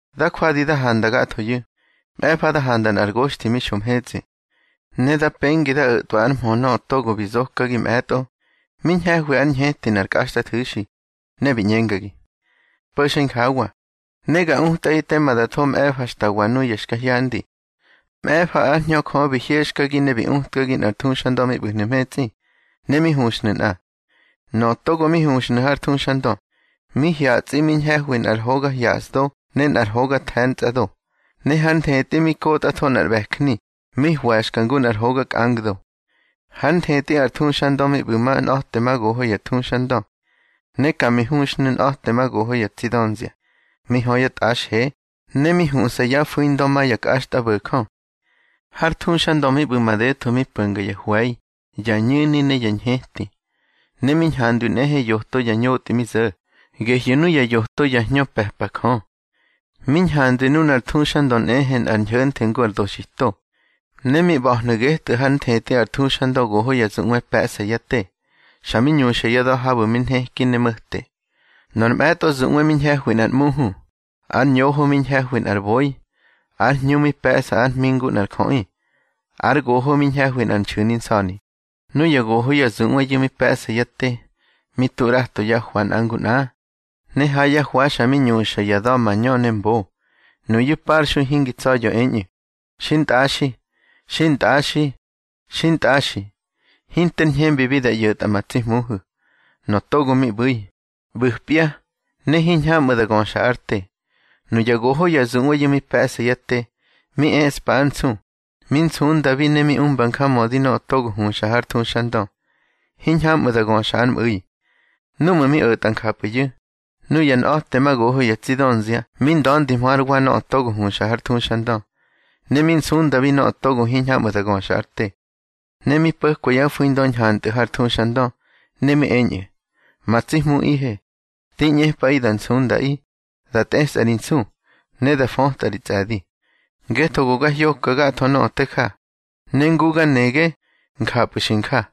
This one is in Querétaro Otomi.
Da jwadi da handa gathoyu̱, mꞌe̱fa da handa nꞌar goxthi mi xo mhetsꞌi. Ne da pengi da o̱twa ár mhö nöꞌö togo bi zokagi mꞌe̱tꞌo, mi ñhe̱hwi ár ñheti nꞌar kꞌaxtꞌathu̱xi, ne bi ꞌñengagi: —Po̱xa injawa, ne ga utꞌaꞌi tema da tho mꞌe̱fa xta wa nuya xka hyandi. Mꞌe̱fa ár Hñö Jö bi hyexkagi ne bi utkagi nꞌar thuxandö mi ꞌbu̱hnu̱ mhetsꞌi, ne mi huxhnu̱ nꞌa. Nöꞌö togo mi huxnu̱ har thuxandö, mi hyatsꞌi ñhe̱hwi nꞌar hoga hyasdo ne nꞌar hoga the̱ntsꞌado. Ne hár nthetꞌi mi kotꞌatho nꞌar ꞌbe̱jni mi hwe̱xka ngu nꞌar hoga kꞌangdo. Hár nthetꞌi ar thuxandö mi ꞌbu̱ ma nꞌa̱temagoho ya thuxandö. Ne ka mi huxhnu̱ nꞌa̱temagoho ya tsi dönzia, mi hö ya tꞌaxhe, ne mi huꞌsa ya fu̱indö ma ya kꞌaxtꞌabo̱jö. Har thuxandö mi ꞌbu̱ madetho mi po̱nga ya hwe̱i, ya ñu̱ni ne ya ñheti. Ne mi ñhandwi nꞌehe yoto ya ñotꞌi mi zo̱, gehyu̱ nuya yoto ya hñö pe̱pa Jö. Mi ñhandwi nunar thuxandö nꞌehe nꞌar ñho̱nthe ngu ar doxito. Ne mi ꞌba̱hnu̱ getꞌu̱ hár nthetꞌi ar thuxandö goho ya zuꞌwe pe̱ꞌsa yá te, xa mi ñuxa ya da̱ habu̱ mi nheki ne mo̱te. Nor mꞌe̱tꞌo zuꞌwe mi ñhe̱hwi nꞌar ꞌmuhu, ár ñoho mi ñhe̱hwi nꞌar boi, ár hñu mi pe̱ꞌsa ár hmi ngu nꞌar jöꞌi, ár goho mi ñhe̱hwi nꞌar nxu̱ni nsa̱ni. Nuya goho ya zuꞌweyu̱ mi pe̱ꞌsa yá te, mi tu ꞌrato yá hwa nꞌa ngu nꞌa, ne ha yá hwa xa mi ñuxa ya da̱ mañö ne mbo. Nuyu̱ parxui hingi tsa̱ya̱ eñꞌu̱: Xintꞌaxi, xintꞌaxi, xintꞌaxi, hinter ñhembibi da ꞌyo̱tꞌa ma tsi Hmuhu̱, nöꞌö togo mi ꞌbu̱i, ꞌbu̱pya, ne hiñhamꞌu̱ da göxa ár te. Nuya goho ya zuꞌweyu̱ mi pe̱ꞌsa yá te, mi eꞌspa ár nsu, mi nsundabi ne mi umba njamödi nöꞌö togo huxa har thuxandö, hiñhamꞌu̱ da göxa ár mꞌu̱i. Núꞌmu̱ mi o̱tꞌa njapꞌu̱yu̱, nuya nꞌa̱temagoho ya tsi dönzia mi nda̱ndihmö hár wa nöꞌö togo huxa har thuxandö, ne mi nsundabi nöꞌö togo hiñhamꞌu̱ da göxa ár te. Ne mi po̱kwa yá fu̱indö ñhantꞌu̱ har thuxandö, ne mi eñꞌu̱: Ma tsi Hmuꞌihe, di ꞌñepꞌaꞌi da nsundaꞌi, da tꞌesꞌa ri nsu, ne da fötꞌa ri tsꞌe̱di. Ngetho go ga hyoka gatho nöꞌö te ja, ne ngu ga nege, njapꞌu̱ xi nja.